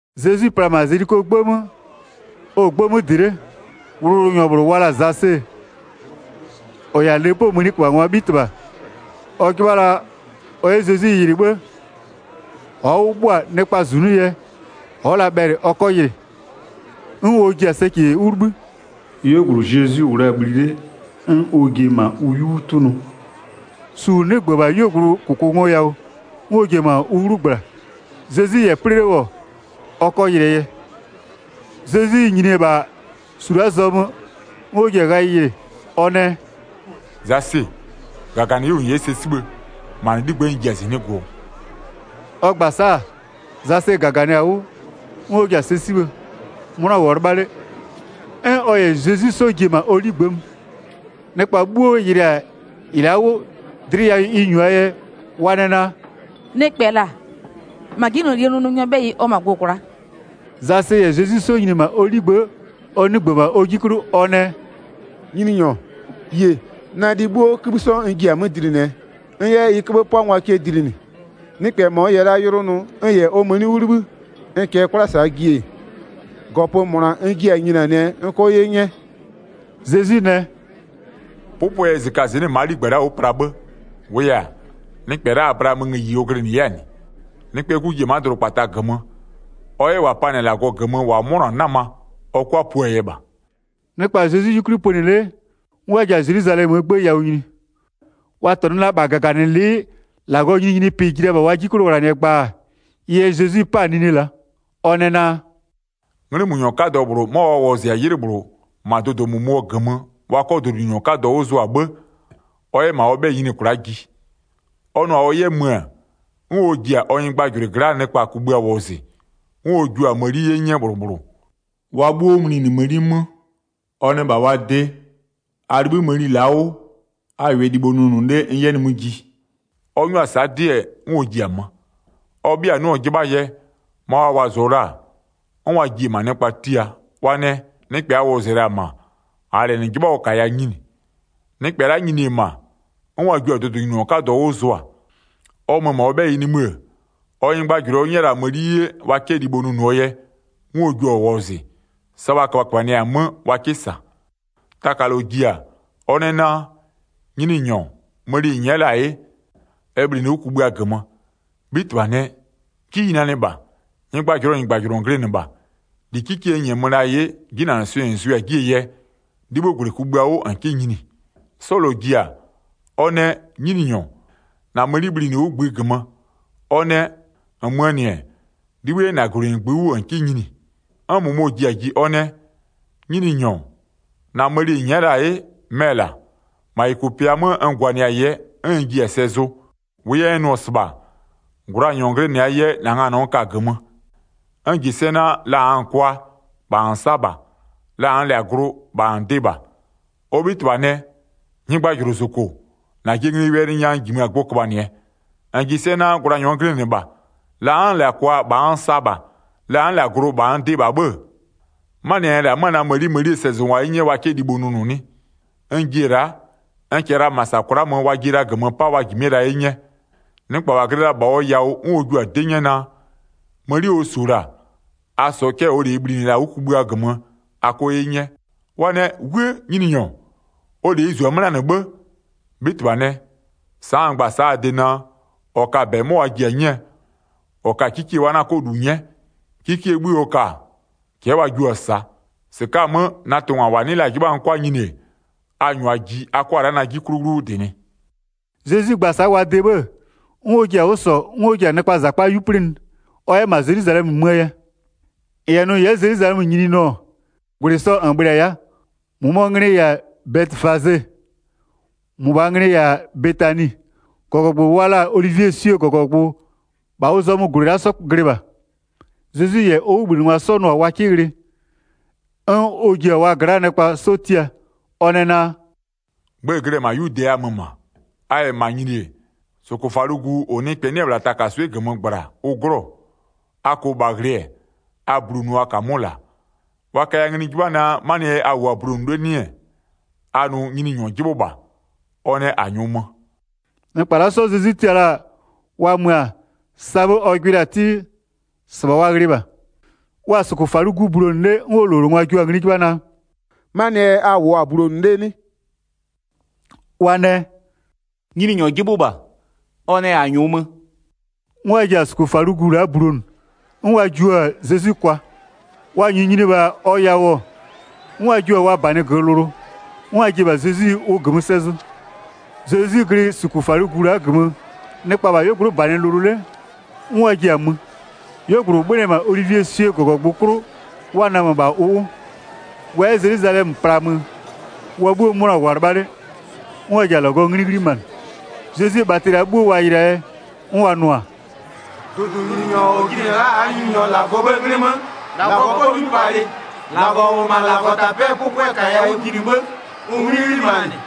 Zezwi pla-a -ma Zelikoo 'gbë 'mö, ɔ-ɔ 'gbë 'mö -dɩ 'le, wʋlʋwʋlʋnyɔ -bhlʋ wa la-a Zase, -ɔ -yɛ-a lepoo mëniköbhangwaa 'bhitɩbha, ɔ 'jɩbha la ɔ 'yɛ Zezwi yɩlɩ 'bhë-ë, ɔ'ɔ 'wʋ 'bhʋa, nɩkpaa -zunʋ yɛ, ɔ'ɔ la bhɛlɩ ɔ 'kɔ yɩlɩ. 'N ɔ ji-a sɛcɛ 'wʋ 'libhï, 'yuogblʋ Zezwi -wʋ la-a bhli 'le, 'n ɔ ji-e -ma ʋ 'yu 'wʋ 'tʋnʋ, su -ʋ 'nɩgbö-ö -bha 'yuogblʋɔ -kʋkʋngoyawʋ, 'n ɔ ji-e -ma ʋ 'wlu -gbla, Zezwi -yɛ 'plɩ 'le -wʋ, ɔ 'kɔ yɩlɩɛ yɛ. Zezwi nyini-e -bha su la'aa zɔmö 'n ɔ ji-a ghayɩ yɩlɩ, ɔ nɛ: “Zase, -gaganɩ 'wʋ -n 'yɛ sɛ 'sibhë, -ma -na 'ligbë'ë n ji-a -zɩnɩ'ɩ gʋ-ʋɔ.” Ɔ gba-a sa'a, Zase -gaganɩ-a 'wʋ, 'n ɔ ji-a sɛ 'sibhë, 'mʋna -wʋɔ 'lɩbha 'le, 'n ɔ -yɛ Zezwi 'sɔ ji-e -ma ɔ 'ligbë'ë mö. Nɩkpa 'bhuo yɩlɩ-a -ɩ la'a 'wʋ, dlɩ yawʋ ɩ -nyua-aa yɛ, wa nɛ naa: “Nɩkpɛ -la -ma 'jinylolie nʋnʋnyɔɔ 'bhɛyɩ ɔ mö-a gʋ-ʋ kwla'a.” Zase -yɛ Zezwi 'sɔ nyini-e -ma ɔ 'ligbë'ë, ɔ 'nɩgbö-ö -bha ɔ 'ji 'klʋ ɔ nɛ: “Nyininyɔ, yie, na lɩ 'bhuo 'kïbhï 'sɔ n jiɩ-a 'mö -dlinɩɛ n 'yɛ ɩ 'köbhë 'pʋangwa cɛ dlinɩ. Nɩkpɛ -mɔ n -yɛ la yʋlʋ nʋ n -yɛ ɔ mëni 'wʋ 'libhï, n -kɛɛ 'kwla -saa ji-e, -gɔpö -mʋna n jiɛ-a nyinianɩɛ n 'kɔ 'ye 'nyɛ.” Zezwi nɛ: “'Pʋpʋɛ yɛ -zɩkazɩnɩ'ɩ ma'a 'ligbë la'a 'wʋ pla 'bhë. -Wʋʋ yɛ-a, nɩkpɛ la'a Ablaamöö ngëyi ɔ glɩnɩ 'yɛ-a -nɩ. Nɩkpɛɛ 'Gu ji-e ma'a dʋdʋkpata -gömö, ɔ 'yɛ -wa panɩ-a -Lagɔ -gömö -wa 'mʋnɔ-a 'nama, ɔ 'kʋa puaa yɛ -bha.” Nɩkpa-a Zezwi 'yukwli pönɩ 'le, 'n wa ji-a Zelwizalɛmöö 'gbë yawʋ nyini. Wa -tɔnʋ la -bha -gaganɩlɩ'ɩ -Lagɔɔ nyininyinipɩ ji la -bha wa 'ji 'klʋ ghlanɩɛ gbaa. Ɩ yɛ Zezwi 'pa-a nine la'a. Ɔ nɛ naa: “'Nglɩmönyɔ 'kadɔ -bhlʋ 'mɔ wa wɔzɩ-a 'ylɩ -bhlʋ -ma dʋdʋ -mʋmʋɔ -gömö wa 'kɔ dʋdʋnyininyɔ 'kadɔ 'wʋ zʋa 'bhë, ɔ 'yɛ -ma ɔ 'bhɛyɩ nyini kwla'a ji. Ɔ nʋ-a ɔ 'yɛ mö-ö, 'n ɔ ji-a ɔ nyɩgbajʋlʋɩ gla'aa nɩkpa kugbïa wɔzɩ, 'n ɔ jua-a mëni 'ye 'nyɛ -bhlʋ -bhlʋ, wa 'bhuo mlinɩ mëni 'mö. Ɔ nɛ -bha wa de: A 'libhï mëni la'a 'wʋ, a -wʋɩɛ libho nʋnʋ 'le n 'yɛ nimï ji. Ɔ 'nyʋa-a sa'a 'dɩ, 'n ɔ ji-a mö. Ɔ 'bhɩa 'nɩɔ-ɔ 'jɩbhaa yɛ, ma wa wɔzɩɔ la-a, 'n wa ji-e -ma nɩkpa tia. Wa nɛ: Nɩkpɛ a wɔzɩ-ɛ -la-a -ma, -aa -lɛ -nɩ 'jɩbha ɔ -kaya nyini. Nɩkpɛ la'a nyini-e -ma, 'n wa jio-a dʋdʋnyininyɔ 'kadɔ 'wʋ zʋa. Ɔ mö-ö -ma ɔ 'bhɛyɩ nimï-ë, ɔ nyɩgbajʋlʋɩ ɔ 'nyɛ la-a mëni 'ye wa 'kɛ libho nʋnʋɔ yɛ, 'n ɔ jua-a wɔzɩ, sa wa köbhaköbhanɩɛ-a 'mö, wa 'kɩ -sa. Taka -lɔ ji-a, ɔ nɛ naa: Nyininyɔ, mëni -n nyɛ'ɛ la-a 'ye, ɛ bhlinɩ 'wʋ kugbïa -gömö. 'Bhitɩbha nɛ: 'Ji ɩ nanɩ -bha! Nyɩgbajʋlʋɔ -nyɩgbajʋlʋ -n glɩnɩ -bha. -Li 'kikie n -nyɛmö la-a 'ye, 'jinanɩswɩɩ -n zʋɩ-a 'jie yɛ, 'libhï -gwlɩ kugbïa 'wʋ -n 'kɩ nyini. 'Sɔ -lɔ ji-a, ɔ nɛ: Nyininyɔ, -na mëni bhlinɩ 'wʋ -ngbï -gömö. Ɔ nɛ: -Nmöö -nɩ-ɛ 'libhï 'yɛ -na -gwlɩ -ngbï 'wʋ -n 'kɩ nyini. 'N -mʋmɔ ji-a ji, ɔ nɛ: Nyininyɔ, -na mëni -n nyɛ'ɛ la-a 'ye, mɛ-ɛ la'a, -ma -yʋkʋpɩa 'mö n gwanɩɛ-a yɛ, 'n n jiɛ-a sɛ zʋ. 21-Wʋʋ yɛ n nʋ-ɔ -sɩbha, gwlanyɔ -n glɩnɩ-aa yɛ, -na nganɔ n ka-a -gömö. N -ji sɛ naa, la -nn -lɛ-a kwa, -bha -n sa -bha. La -nn -lɛ-a glʋ, -bha n dɩ -bha. Ɔ 'bhitɩbha nɛ: Nyɩgbajʋlʋ -zoko, -najɩɛ nglie wɛlɩ nya n -jimö-a gbʋ köbhanɩɛ. -N -ji sɛ naa, gwlanyɔ n glɩnɩ -bha, la n'n -lɛ-a kwa -bha n sa -bha, la n'n -lɛ-a glʋ -bha n dɩ -bha 'bhë-ë, 'manɩɛ yɛ -nn -lɛ-a 'mö-a na mëni mënie sɛzʋngwa 'ye 'nyɛ wa 'kɛ libho nʋnʋ 'nɩ? N ji-e la'a, n -kɛɛ la -ma -sa kwla'a mö wa jie la -gömö 'pa wa -jimɩ'ɩɛ la 'ye 'nyɛ. Nɩkpa -wa glɩ la-a -bha ɔ yawʋ 'n ɔ jua-a 'dɩ 'nyɛ naa: Mëni ɔ -su-o -la, a -sɔɔ cɛ'ɛ -ɔɔ -leyi bhlinɩ-ɛ -la 'wʋ kugbïa -gömö, a 'kɔ 'ye 'nyɛ. Wa nɛ: 'Wuë! Nyininyɔ, ɔ -leyi -zu-a 'mö la'a -nɩ 'bhë! 'Bhitɩbha nɛ: Sa'a n gba-a sa'a a de naa: -Ɔ ka-a -bɛ 'mɔ wa ji-a 'nyɛɛ, -ɔ ka-a 'kikie wa 'na 'kɔ -lu 'nyɛ, 'kikiee 'bhë ɔ ka-a, cɛ'ɛ wa jio-a -saa. 27-Sɩka'a-a 'mö, na tʋngwa -wa 'nɩ la-a 'jɩbha n 'kʋa nyini-e, a -nyʋa ji a 'kʋa la'a na 'ji 'klʋ 'wlu 'wʋ -dɩnɩ.” Zezwi gba-a sa'a wa de 'bhë-ë, 'n ɔ ji-a 'wʋ -sɔ 'n ɔ ji-a nɩkpaa -zakpa 'yu 'plɩnɩ ɔ 'yɛ -ma Zelwizalɛmö möö yɛ. 29-N -yɛ nʋ -n 'yɛ Zelwizalɛmö nyini nʋ-ɔ, -gwlɩ sɔ -n bhlɩ-a ya'a. -Mʋmʋɔ nglɩ-ɩ -yɛ-a Bɛtɩfaze, -mʋbhaa nglɩ-ɩ -yɛ-a Betani, -gɔgɔgbʋ wa la-a olivieswie -gɔgɔgbʋ -bha ʋ zɔmö -gwlɩ la'a 'sɔ glɩ -bha. Zezwi -yɛ ɔ 'wʋbhlinɩngwa 'sɔ nʋ-a wa 'kɩ ghlɩ, 'n ɔ ji-a wa gla'aa nɩkpa 'sɔ tia, ɔ nɛ naa: “Gbë-ë glɩ-ɛ -la 'yude a mö -ma, a -yɛ -ma nyini-e, -sʋkʋfalʋgu -ʋ nɩkpɛ 'nɩ-ɛ -bhla takaswɩ'ɩ -gömö -gbla, ʋ 'glɔ-ɔ. A -kʋʋ -bha ghlɩ-ɛ, a bulonʋʋ a -kamʋ'ʋ -la. Wa kaya ngli 'jɩbha naa, 'manɩɛ yɛ a -wʋʋ-a bulonʋ 'le 'nɩ-ɛ, a nʋ: Nyininyɔ 'jɩbhʋ -bha, ɔ nɛ -a -nyʋʋ mö.” Nɩkpa la'a 'sɔ Zezwi tia la-a wa mö-a, sa 'bhë ɔ gbɩ la-a 'tɩ, -sɩbha wa ghlɩɩ -bha. Wa-a -sʋkʋfalʋgu bulonʋ 'le 'n ʋ -lowlengwa jua-a ngli 'jɩbha naa: “'Manɩɛ yɛ a -wʋʋ-a bulonʋ 'le 'nɩ?” Wa nɛ: “Nyininyɔ 'jɩbhʋ -bha, ɔ nɛ -a -nyʋʋ mö.” 'N wa ji-a -sʋkʋfalʋgu la'a bulonʋ, 'n wa jiʋ-a Zezwi kwa. Wa -nyʋʋ nyini-e -bha ɔ yawʋ-ɔ, 'n wa jiʋ-a wa -banɩ -gömö lʋlʋ, 'n wa ji-e -bha Zezwi ʋ -gömö sɛ zʋ. Zezwi glɩ -sʋkʋfalʋgu la'a -gömö, nɩkpa-a -bha 'yuogblʋ'ʋ -banɩ lʋlʋ 'le, 'n wa ji-a mö. 'Yuogblʋ -ʋ 'bhönɩ-ɛ -ma olivieswie -gɔgɔgbʋ 'klʋ wa namö -bha ʋ 'wʋ, wa 'yɛ Zelwizalɛmö plaa mö, wa 'bhuo 'mʋna -wʋ-a 'lɩbha 'le, 'n wa ji-a -Lagɔɔ 'nglɩ 'ghlimanɩ, Zezwie bhatɩ la'a 'bhuo wa yɩlɩ-aa yɛ. 'N wa nʋ-a: “Dʋdʋnyininyɔ -ɔ jinɩ-ɛ la'a -aa Nyininyɔ -Lagɔɔ 'bhëë 'nglɩ 'mö, -Lagɔ 'pɔ 'nyupalɩ! -Lagɔ -ʋ -wʋ-ɔ -ma -Lagɔtapɛ'ɛɛ 'pʋpʋɛ -kaya 'wʋ jinɩ 'bhë, ʋ 'nglɩ 'ghlimanɩ!”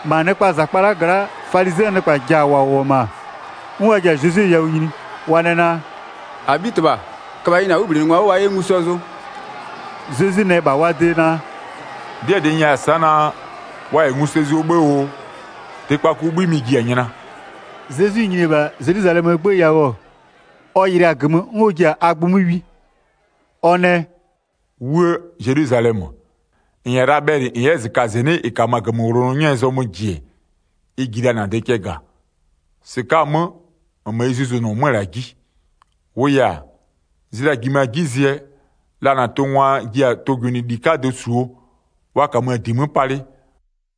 39-Ma nɩkpaa -zakpa la'a gla'aa falizɩɛ nɩkpa -ja -wʋ-ɔ -ma, 'n wa ji-a Zezwi yawʋ nyini, wa nɛ naa: “-Abhitɩbha, köbha yɩ -na 'wʋbhlinɩngwa 'wʋ wa 'yɛ ngu sɛ zʋ.” Zezwi nɛ -bha wa de naa: “'Dɩɛ -dɩ n 'nyɛya-a sa'a naa, wa -yɛ ngu sɛ zʋɔ 'bhë oo, tɩkpakuo 'bhï mɩ-ɩ ji-a nyla.” Zezwi nyini-e -bha Zelwizalɛmöö 'gbë yawʋ, ɔ yɩlɩa-a -gömö 'n ɔ ji-a a gbʋ 'mö wi. Ɔ nɛ: “'Wuë! Zelwizalɛmö, -n -yɛ la bhɛlɩ -n 'yɛ -zɩkazɩnɩ'ɩ -ɩ -kamö-a -gömöwlonɔ 'nyɛɛ zɔmö -ji-e, ɩ ji la -na de cɛ -ga. -Sɩka'a-a 'mö, -nmö ɩ 'zuzonʋɔ 'mö-ö -la 'ji. 43-Wʋʋ yɛ-a, zlɩa-a -jimö-a 'ji zɩɛ, la -na tʋngwa ji-a tʋgwɩnɩli 'kadɩ -suo, wa -kamö -di 'mö palɩ,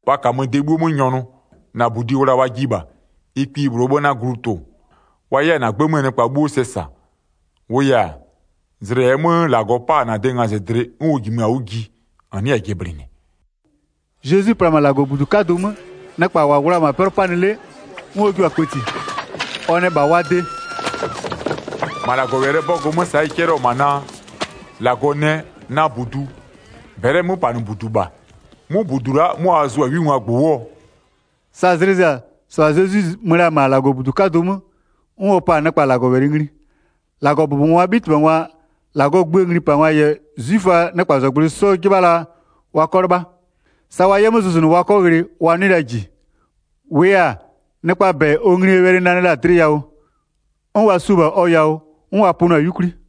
wa -kamö de 'bhuo 'mö nyɔnʋ. 44-Na -budi wla wa jiɩ -bha, ɩ kpiyi -bhlʋɔ 'bhë 'na glu tʋ-ʋ, wa 'yɛ-a -na 'gbë 'möö nɩkpa 'bhuo sɛ -sa. -Wʋʋ yɛ-a, zlɩ -ɛɛ 'mö -Lagɔ 'pa-a -na de ngazɩdlɩ 'n ʋ jimö-a 'wʋ ji, -n 'nɩɛ-ɛ jɩblɩnɩ.” Zezwi pla-a -ma -Lagɔbudu 'kadʋ 'mö, nɩkpa -wa -wʋ-ɔ -ma 'pɛlʋ 'panɩ 'le, 'n ɔ jua-a kpëti. Ɔ nɛ -bha wa de: “-Ma -Lagɔwɛlɩɛ 'bɔgʋ 'mö sa'a ɩ 'cɛlɩɔ-ɔ -ma naa: -Lagɔ nɛ: Na -budu -bɛlɩɛ 'möpanɩbudu -bha. 'Mʋ -budu la'a, 'mʋ a zʋa 'wingwaa -gbʋ 'wʋɔ?” Sa zlɩ zɩ-a, -sɩbha Zezwi mö la-a -ma -Lagɔbudu 'kadʋ 'mö 'n ɔ pa-a nɩkpa -Lagɔwɛlɩ ngli. -Lagɔbʋbɔngwaa 'bhitɩbhangwa-a, -Lagɔɔ gböö nglipangwa -yɛ 'zwiföaa nɩkpazɔgblʋɩ 'sɔ 'jɩbha la wa 'kɔ 'lɩbha. Sa wa 'yɛ 'mö zʋzʋnʋ wa 'kɔ ghlɩ wa 'nɩɩ la -ji, -wʋʋ yɛ-a, nɩkpaa -bɛ ɔ nglie wɛlɩ nanɩ la-a dlɩ yawʋ, 'n wa su-o -bha ɔ yawʋ 'n wa pönɩɔ-a 'yukwli.